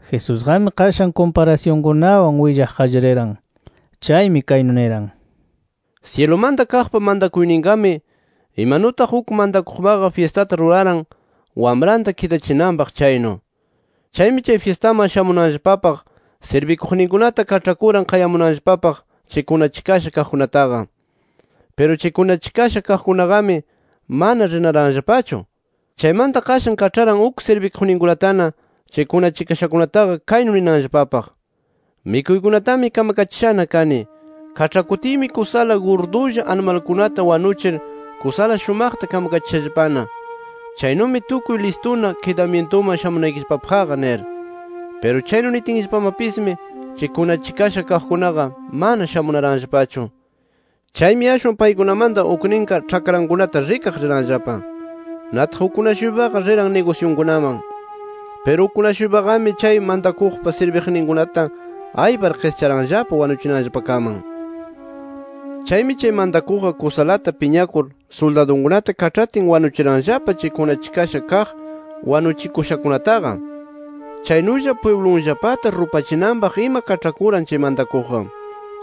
Jesusqami qashan kumparasyunkunawan willaq qallariran. Chaymi kaynu niran: “Syilumanta kaqpa mantakuyninqami, imanutaq uk mantakuqmaqa fyistata ruraran wamranta kidachinanpaq chaynu. Chaymi chay fyistaman shamunanllapapaq sirbikuqninkunata kaĉhakuran qayamunanllapapaq chay kunachikasha kaqkunataqa. Piru chay kunachikasha kaqkunaqami mana rinaranllapachu. Chaymanta qashan kaĉharan uk sirbikuqninkunatana chay kunachikashakunataqa kaynu ninanllapapaq: ‘Mikuykunatami kamakachishana kani. Kaĉhakutiymi kusala gurdulla animalkunata wanuchir kusala shumaqta kamkachishallapana. Chaynumi tukuy listuna kidamyintuman shamunaykillapapaqqa’ nir. “Piru chaynu nitinllapamapismi chay kunachikasha kaqkunaqa mana shamunaranllapachu. Chaymi ashwan paykunamanta ukninqa ĉhakrankunata rikaq riranllapa. Nataq ukkuna-shuypaqa riran nigusyunkunaman. Piru ukkuna-shuypaqami chay mantakuqpa sirbikuqninkunata aypar qischaranllapa wanuchinanllapakaman. “Chaymi chay mantakuqqa kusalata piñakur suldadunkunata kaĉhatin wanuchiranllapa chay kunachikasha kaq wanuchikushakunataqa. Chaynulla pwiblunllapata rupachinanpaq ima kaĉhakuran chay mantakuqqa.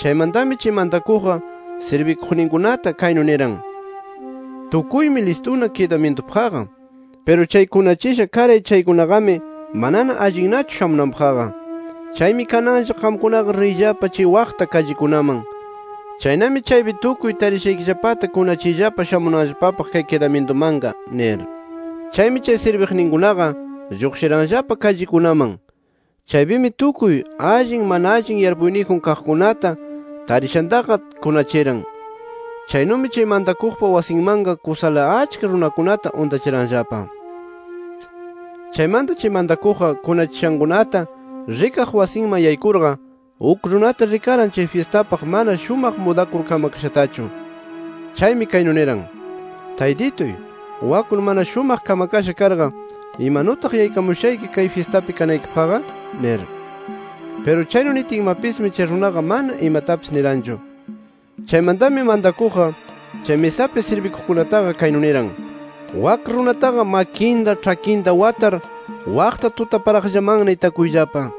Chaymantami chay mantakuqqa sirbikuqninkunata kaynu niran: ‘Tukuymi listuna kidamyintupaqqa. Piru chay kunachisha karay chaykunaqami manana allinnachu shamunanpaqqa. Chaymi kananlla qamkunaqa riyllapa chay waqta kallikunaman. Chaynami chaypi tukuy tarishaykillapata kunachiyllapa shamunanllapapaq kay kidamyintumanqa’ nir. “Chaymi chay sirbiqninkunaqa lluqshiranllapa kallikunaman. Chaypimi tukuy allin, mana allin yarpuyniyjun kaqkunata tarishantaqa kunachiran. Chaynumi chay mantakuqpa wasinmanqa kusala achka runakunata untachiranllapa. “Chaymanta chay mantakuqqa kunachishankunata rikaq wasinman yaykurqa, uk runata rikaran chay fyistapaq mana shumaq mudakur kamakashatachu. Chaymi kaynu niran: ‘Taytituy, waknu mana shumaq kamakasha karqa ¿imanutaq yaykamushayki kay fyistapi kanaykipaqqa?’ nir. “Piru chaynu nitinmapismi chay runaqa mana imatapis niranchu. Chaymantami mantakuqqa chay misapi sirbikuqkunataqa kaynu niran: ‘Wak runataqa makinta, ĉhakinta watar, waqta tutaparaqllamanna itakuyllapa.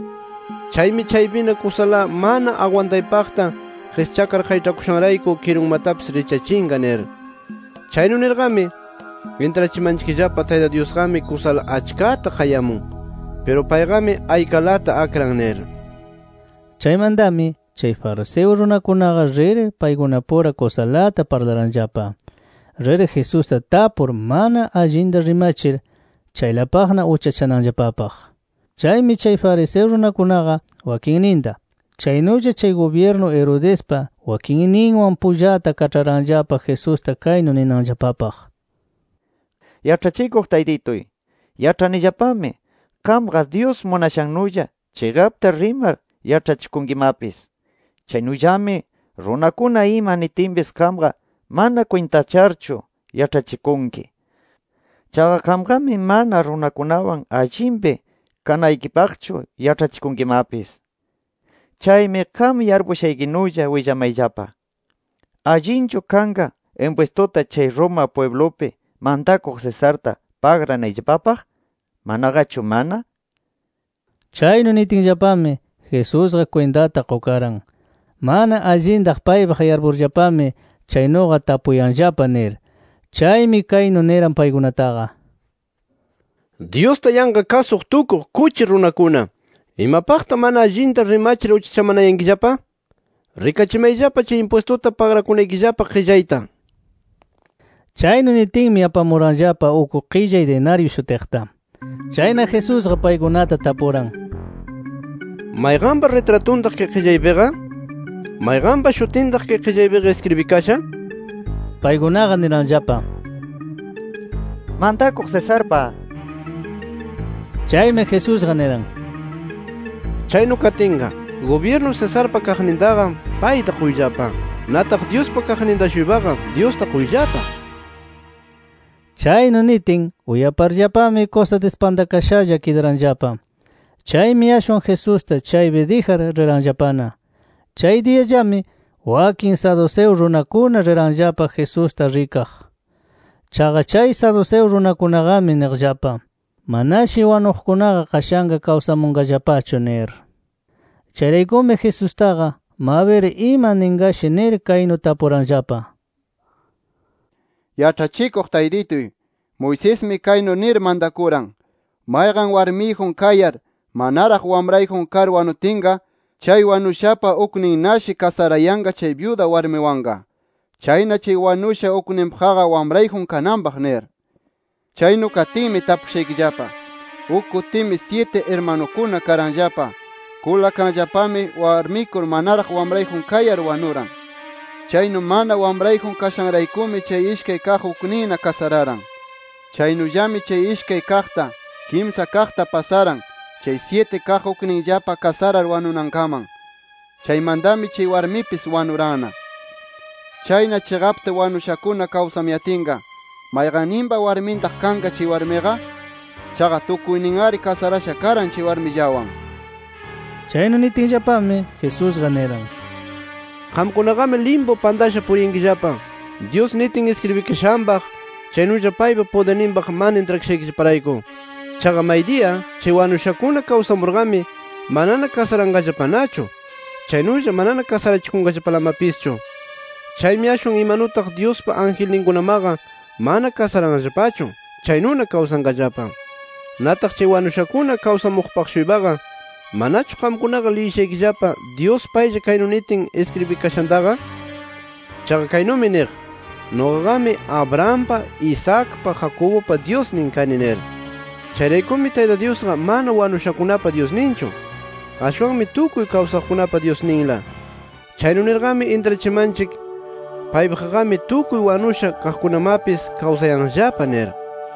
Chaymi chaypina kusala mana agwantaypaqta qischakar qayĉhakushanrayku kirunmatapis richyachinqa’ nir. “Chaynu nirqami intrachimanchikllapa, Tayta Dyusqami kusala achkata qayamun. Piru payqami aykalata akran nir”. Chaymantami, chay fariseo runakunaqa rir paykunapura kusalata parlaranllapa, rir Jesusta tapur mana allinta rimachir chaylapaqna uchachananllapapaq. Chaymi chay fariseo runakunaqa wakinninta, chaynulla chay gubyirnu Herodespa wakinninwan pullata kaĉharanllapa Jesusta kaynu ninanllapapaq: —Yaĉhachikuq Taytituy, yaĉhanillapami qamqa Dyus munashannulla chiqapta rimar yaĉhachikunkimapis. Chaynullami runakuna ima nitinpis qamqa mana kwintacharchu yaĉhachikunki. Chaqa qamqami mana runakunawan allinpi kanaykipaqchu yaĉhachikunkimapis. Chaymi qam yarpushaykinulla willamayllapa: ¿Allinchu kanqa impwistuta chay Roma pwiblupi mantakuq Cesarta, pagranayllapapaq, manaqachu mana? nir. Chaynu nitinllapami Jesusqa kwintata qukaran, mana allinta paypaq yarpurllapami chaynuqa tapuyanllapa nir. Chaymi kaynu niran paykunataqa: —Dyusta yanqa kasuq tukuq, kuchi runakuna ¿imapaqtaq mana allinta rimachir uchachamanayankillapa? Rikachimayllapa chay impwistuta pagrakunaykillapa qillayta nir. Chaynu nitinmi apamuranllapa uk qillay dinaryu shutiqta. Chayna Jesusqa paykunata tapuran: —¿Mayqanpa ritratuntaq kay qillaypiqa? ¿Mayqanpa shutintaq kay qillaypiqa iskribikasha? nir. Paykunaqa niranllapa: —Mantakuq Cesarpa nir. Chaymi Jesusqa niran: —Chaynu katinqa, gubyirnu Cesarpa kaqnintaqa payta quyllapa. Nataq Dyuspa kaqninta-shuypaqa Dyusta quyllapa nir. Chaynu nitin, uyaparllapami kusa dispantakashalla kidaranllapa. Chaymi ashwan Jesusta chaypi dijar riranllapana. Chay diyallami, wakin saduceo runakuna riranllapa Jesusta rikaq. Chaqa chay saduceo runakunaqami niqllapa: “Manashi wanuqkunaqa qashanqa kawsamunllapachu” nir. Chayraykumi Jesustaqa, mabir ima ninqashi nir kaynu tapuranllapa: —Yaĉhachikuq Taytituy, Moisesmi kaynu nir mantakuran: ‘Mayqan warmiyjun kayar, manaraq wamrayjun kar wanutinqa, chay wanushapa ukninnashi kasarayanqa chay byuda warmiwanqa. Chayna chay wanusha ukninpaqqa wamrayjun kananpaq’ nir. “Chaynu katinmi tapushaykillapa: Uk kutimi syiti irmanukuna karanllapa. Kulakanllapami, warmikur manaraq wamrayjun kayar wanuran. Chaynu mana wamrayjun kashanraykumi chay ishkay kaq ukninna kasararan. Chaynullami chay ishkay kaqta, kimsa kaqta pasaran, chay syiti kaq ukninllapa kasarar wanunankaman. Chaymantami chay warmipis wanuranna. “Chayna chiqapta wanushakuna kawsamuyatinqa, ¿mayqanninpa warmintaq kanqa chay warmiqa? Chaqa tukuynin-ari kasarasha karan chay warmillawan”. Chaynu nitinllapami, Jesusqa niran: —Qamkunaqami limpu pantasha puriyankillapa, Dyus nitin iskribikashanpaq, chaynulla paypa pudirninpaq mana intrakashaykillaparayku. Chaqa maydiya chay wanushakuna kawsamurqami, manana kasaranqallapanachu, chaynulla manana kasarachikunqallapalamapischu. Chaymi ashwan imanutaq Dyuspa angelninkunamaqa mana kasaranllapachu chaynuna kawsanqallapa. Nataq chay wanushakuna kawsamuqpaq-shuypaqa, ¿manachu qamkunaqa liyishaykillapa Dyus paylla kaynu nitin iskribikashantaqa? Chaqa kaynumi niq: ‘Nuqaqami Abrahampa, Isaacpa, Jacobupa Dyusnin kani’ nir. Chayraykumi Tayta Dyusqa mana wanushakunapa Dyusninchu, ashwanmi tukuy kawsaqkunapa Dyusninla. Chaynu nirqami intrachimanchik, paypaqqami tukuy wanusha kaqkunamapis kawsayanllapa nir.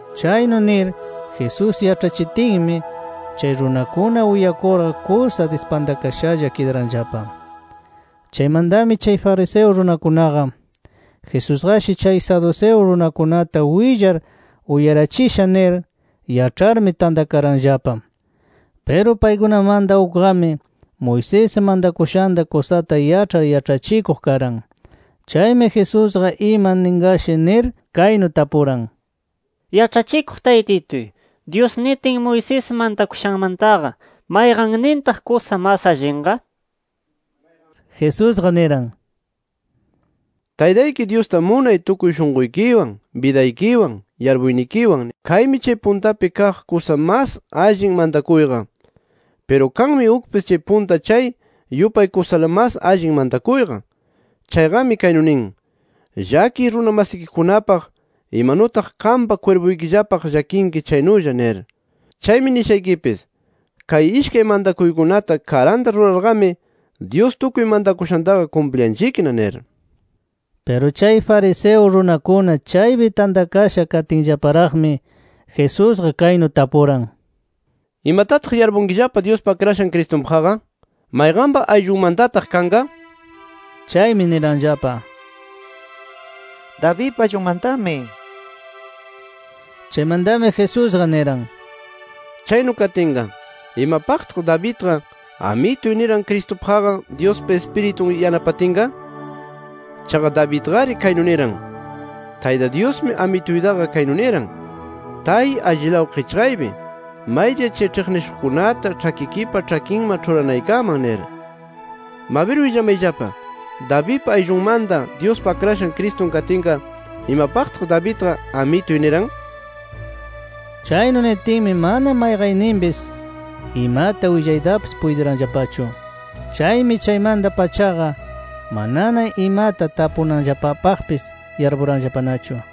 Chaynu nir Jesús yaĉhachitinmi, chay runakuna uyakurqa kusa dispantakashalla kidaranllapa. Chaymantami chay fariseo runakunaqa, Jesusqashi chay saduceo runakunata willar uyarachisha nir yaĉharmi, tantakaranllapa. Piru paykunamanta ukqami Moisés mantakushanta kusata yaĉhar yaĉhachikuq karan. Chaymi Jesusqa ima ninqashi nir, kaynu tapuran: —Yaĉhachikuq Taytituy, ¿Dyus nitin Moisés mantakushanmantaqa mayqannintaq kusa mas allinqa? nir. Jesusqa niran: —‘Taytayki Dyusta munay tukuy shunquykiwan, bidaykiwan, yarpuynikiwan’ nir. Kaymi chay puntapi kaq kusa mas allin mantakuyqa. Piru kanmi ukpis chay punta chay yupay kusala mas allin mantakuyqa. Chayqami kaynu nin: ‘Llakiy runa masikikunapaq, imanutaq qampa kwirpuykillapaq llakinki chaynulla’ nir. Chaymi nishaykipis: Kay ishkay mantakuykunata karanta rurarqami, Dyus tukuy mantakushantaqa kumpliyanchikna nir. Piru chay fariseo runakuna chaypi tantakasha katinllaparaqmi, Jesusqa kaynu tapuran: —¿Imatataq yarpunkillapa Dyuspa Akrashan Cristunpaqqa? ¿Mayqanpa ayllunmantataq kanqa? nir. Chaymi niranllapa: —Davidpa ayllunmantami nir. Chaymantami Jesusqa niran: —Chaynu katinqa, ¿imapaqtaq Davidqa, ‘Amituy’ niran Cristupaqqa, Dyuspa Ispiritun yanapatinqa? Chaqa Davidqari kaynu niran: ‘Tayta Dyusmi, Amituytaqa kaynu niran: Tay allilaw qichqaypi, maydiya chay ĉhiqnishuqkunata ĉhakikipa ĉhakinman ĉhuranaykaman nir’. Mabir willamayllapa: Davidpa ayllunmanta Dyuspa Akrashan Cristun katinqa, ¿imapaqtaq Davidqa ‘Amituy’ niran? Chaynu nitinmi mana mayqanninpis imata willaytapis puytiranllapachu. Chaymi chaymanta-pachaqa, manana imata tapunanllapapaqpis yarpuranllapanachu.